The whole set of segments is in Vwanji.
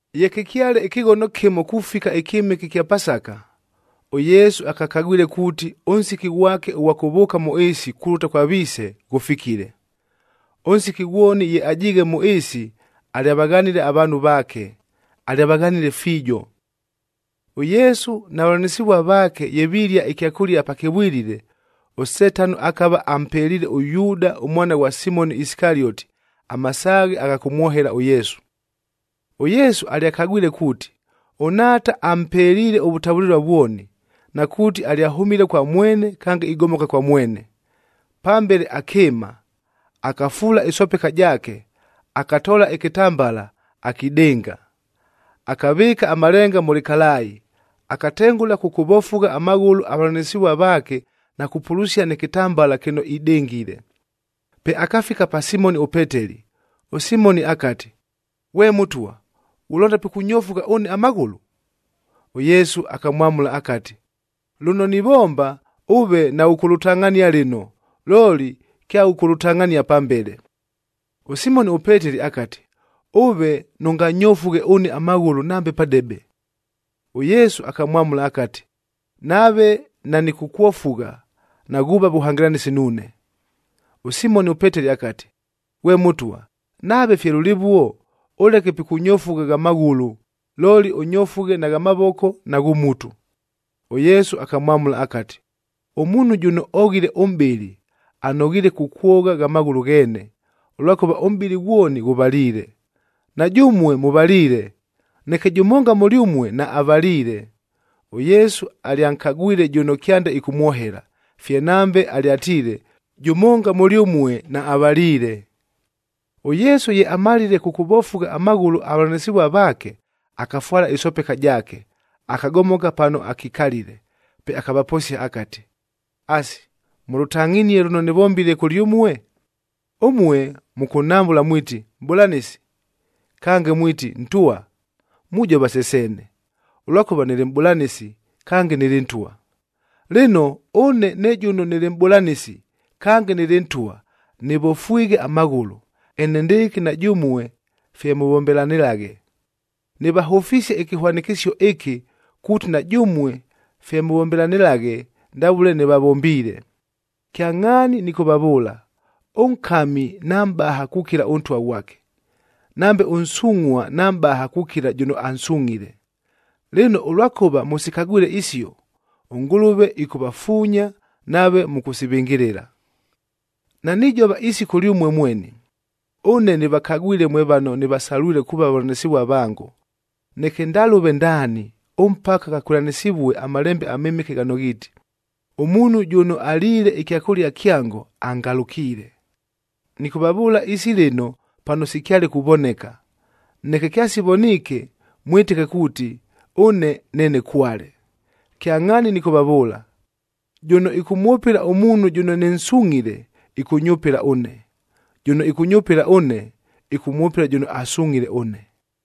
Ye kɨkyale ɨkɨghono kɨmo kufika ɨkyɨmɨke ɨkya Pasaka, ʉYesu akakagwile kuuti, ʉnsiki ghwake ʉghwa kʉvʉʉka mʉ ɨɨsi kulʉta kwa Viise, ghʉfikile. Ʉnsiki ghwoni ye ajiighe mʉ ɨɨsi alyavaghanile avaanhu vaake, alyavaghanile fiijo. ɄYesu na vavʉlanɨsɨvua vaake ye vilia ɨkyakʉlia pakɨvwilile, ʉSetano akava ampeliile ʉYuuda ʉmwana ghwa Simoni Isikalioti amasaaghe agha kʉmwohela ʉYesu. ɄYesu alyakagwile kuuti, ʉNhaata ampeliile ʉvʉtavʉlɨlua vwoni, na kuuti alyahʉmile kwa mwene kange igomoka kwa mwene. Pambele akɨɨma, akafuula ɨsopeka jaake, akatoola ɨkɨtambala, akidɨnga. Akavɨɨka amalenga mʉ lɨkalai, akatengʉla kʉkʉvofugha amaghʉlʉa avavʉlanɨsɨvua vaake na kupulusia nɨ kɨtambala kɨno idɨngile. Pe akafika pa Simoni ʉPeteli, ʉSimoni akati, “Ghwe Mʉtwa, ghulonda pikʉnyofugha ʉne amaghʉlʉ?” ɄYesu akamwamʉla akati, “Lʉno nivomba, ʉve naghʉkʉlʉtangʼhania lɨno, looli kyaghʉkʉlʉtangʼhania pambele.” ɄSimoni ʉPeteli akati, “Ʉve nʉnganyofughe ʉne amaghʉlʉ nambe padebe!” ɄYesu akamwamʉla akati, “Nave nanɨkʉkwofugha, naghuuva vʉhangɨlanɨsi nuune.” ɄSimoni ʉPeteli akati, “Ghwe Mʉtwa, nave fye lʉlɨvuo, ʉleke pikʉnyofugha gha maghʉlʉ, looli ʉnyofughe nagha mavoko naghʉ mutu.” ɄYesu akamwamʉla akati, “Ʉmuunhu jʉno oghile ʉmʼbɨlɨ, anoghiile kukwogha gha maghʉlʉ gheene, ʉlwakʉva ʉmʼbɨlɨ ghwoni ghʉvaliile. Na jʉmue mʉvaliile, neke jʉmonga mʉlyʉmue naavaliile.” ɄYesu alyankagwile jʉno kyande ɨkʉmwohela, fye nambe alyatiile, “Jʉmonga mʉlyʉmue naavaliile.” ɄYesu ye amalile kʉkʉvofugha amaghʉlʉ avavʉlanɨsɨvua vaake, akafwala ɨsopeka jaake, akagomoka pano akikalile, pe akavaposia akati, “Asi, mʉlʉtangʼhinie lʉno nɨvombile kʉlyʉmue? Ʉmue mʉkʉnhambʉla mwiti, ‘Mʼbʉlanɨsi,’ kange mwiti, ‘Ntwa.’ Mujova se seene, ʉlwakʉva nɨlɨ Mʼbʉlanɨsi, kange nɨlɨ Ntwa. Lɨno, ʉne ne jʉno nɨlɨ Mʼbʉlanɨsi, kange nɨlɨ Ntwa nɨvofwighe amaghʉlʉ, enendɨɨkɨ na jʉmue fye mʉvombelanɨlaghe. Nɨvahʉfisie ɨkɨhwanɨkɨsio ɨkɨ, kuuti na jʉmue fye mʉvombelanɨlaghe ndavʉle nɨvavombiile. Kyangʼhaani nɨkʉvavʉʉla, ʉnkami namʼbaha kukila ʉntwa ghwake, nambe ʉnsungʼhua namʼbaha kukila jʉno ansungʼhile. Lɨno, ʉlwakʉva mʉsikagwile isio, ʉNgʉlʉve ɨkʉvafuunya nave mʉkʉsivɨngɨlɨla. “Nanijova isi kʉlyʉmue mweni. Ʉne nɨvakagwile mwe vano nɨvasalwile kuuva vavʉlanɨsɨvua vango. Neke ndalʉve ndaani ʉmpaka ghakwɨlanɨsɨvue aMalembe aMɨmɨke ghano ghiiti, ‘Ʉmuunhu jʉno aliile ɨkyakʉlia kyango, Nɨkʉvavʉʉla isi lɨno pano sikyale kuvoneka, neke kyasivoniike mwɨtɨke kuuti, ‘Ʉne Neene Kwale.’ Kyangʼhaani nɨkʉvavʉʉla, jʉno ɨkʉmwʉpɨla ʉmuunhu jʉno nɨnsungʼhile, ɨkʉnyʉpɨla ʉne; jʉno ɨkʉnyʉpɨla ʉne, ɨkʉmwʉpɨla jʉno asungʼhile ʉne.”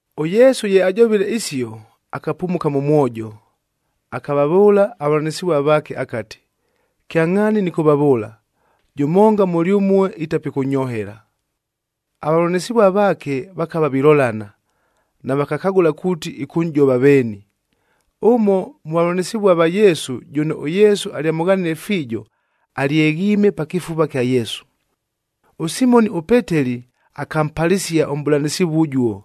ɄYesu ye ajovile isio, akapumuka mʉ mwojo, akavavʉʉla avavʉlanɨsɨvua vaake akati, “Kyangʼhaani nɨkʉvavʉʉla, jʉmonga mʉlyʉmue itapikʉnyohela.” Avavʉlanɨsɨvua vaake vakava vilolana, navakakagʉla kuuti ɨkʉnʼjova veeni. Ʉmo mʉ vavʉlanɨsɨvua va Yesu jʉno ʉYesu alyamʉghanile fiijo, alyeghiime pa kɨfuva kya Yesu. ɄSimoni ʉPeteli akampalɨsia ʉmʼbʉlanɨsɨvua ʉjuo,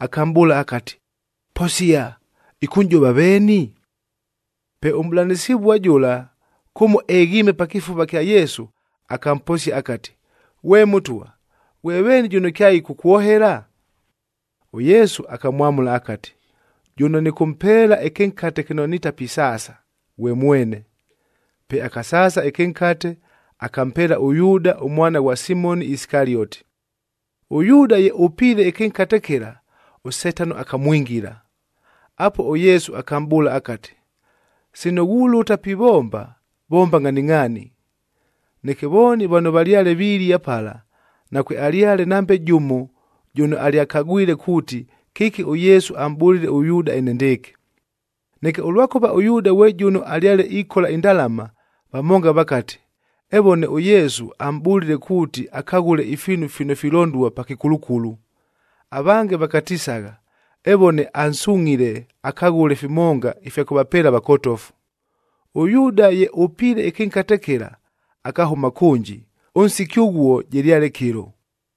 akamʼbʉʉla akati, “Posia, ɨkʉnʼjova veeni?” Pe ʉmʼbʉlanɨsɨvua jʉla kʉmo eghiime pa kɨfuva kya Yesu, akamposia akati, “Ghwe Mʉtwa, ghwe veeni jʉno kyaɨkʉkwohela?” ɄYesu akamwamʉla akati, “Jʉno nɨkʉmpeela ɨkɨnkate kɨno nitapisaasa, ghwe mwene.” Pe akasaasa ɨkɨnkate, akampeela ʉYuuda ʉmwana ghwa Simoni Isikalioti. ɄYuuda ye ʉpiile ɨkɨnkate kɨla, ʉSetano akamwingila. Apuo ʉYesu akamʼbʉʉla akati, “Sino ghulʉta pivomba, vomba ngʼhaningʼhaani!” Neke vooni vano valyale vilia pala, nakwealyale nambe jʉmo jʉno alyakagwile kuuti, kɨki ʉYesu amʼbʉlile ʉYuuda enendɨɨkɨ. Neke ʉlwakʉva ʉYuuda ghwe jʉno alyale ikola indalama, vamonga vakati, evone ʉYesu amʼbʉlile kuuti akaghʉle ifiinu fino filondua pa kɨkulukulu; avange vakatisagha, evone ansungʼhile akaghʉle fimonga ifya kʉvapeela avakotofu. ɄYuuda ye ʉpiile ɨkɨnkate kɨla, akahʉma kʉnji. Ʉnsiki ʉghuo jɨlyale kɨlo.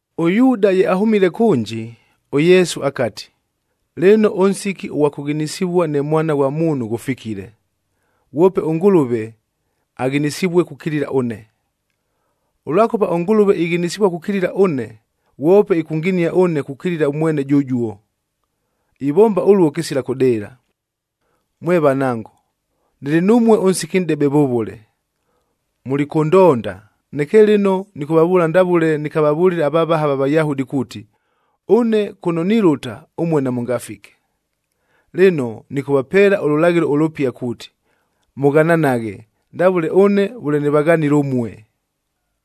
ɄYuuda ye ahʉmile kʉnji, ʉYesu akati, “Lɨno, ʉnsiki ʉghwa kʉghinisivua ne Mwana ghwa Muunhu ghʉfikile, ghwope ʉNgʉlʉve aghinisivue kukilila ʉne. Ʉlwakʉva ʉNgʉlʉve ighinisivua kukilila ʉne, ghwope ɨkʉnginia ʉne kukilila ʉmwene jʉjuo. Ivomba ʉluo kɨsila kʉdɨɨla. “Mwe vanango, nɨlɨ numue ʉnsiki nʼdebe vʉvʉle. Mulikʉndonda, neke lɨno nɨkʉvavʉʉla ndavʉle nɨkavavʉlile avavaha va Vayahudi kuuti, ‘Ʉne kʉno nilʉta ʉmue namʉngafike.’ Lɨno, nɨkʉvapeela ʉlʉlaghɨlo ʉlʉpia kuuti, ‘Mʉghananaghe, ndavʉle ʉne vʉle nɨvaghanile ʉmue.’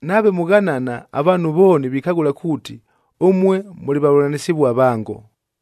Nave mughanana, avaanhu vooni vikagʉla kuuti ʉmue mʉlɨ vavʉlanɨsɨvua vango.”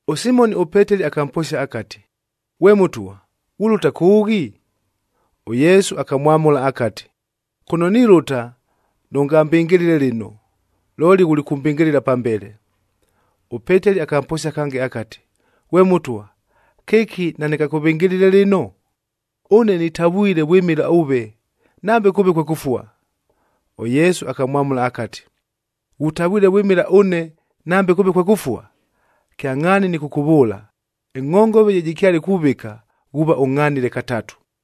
ɄSimoni ʉPeteli akamposia akati, “Ghwe Mʉtwa, ghulʉta kʉʉghi?” ɄYesu akamwamʉla akati, “Kʉno nilʉta nʉngambɨngɨlɨle lɨno, looli ghulikʉmbɨngɨlɨla pambele.” ɄPeteli akamposia kange akati, “Ghwe Mʉtwa, kɨki nanɨngakʉvɨngɨlɨle lɨno? Ʉne nitavwile vwɨmɨla ʉve, nambe kʉʉve kwe kʉfua.” ɄYesu akamwamʉla akati, “Ghutavwile vwɨmɨla ʉne, nambe kʉʉve kwe kʉfua? Kyangʼhaani nɨkʉkʉvʉʉla, ɨngʼhongove ye jɨkyale kuvɨka, ghuuva ʉngʼhanile katatu.”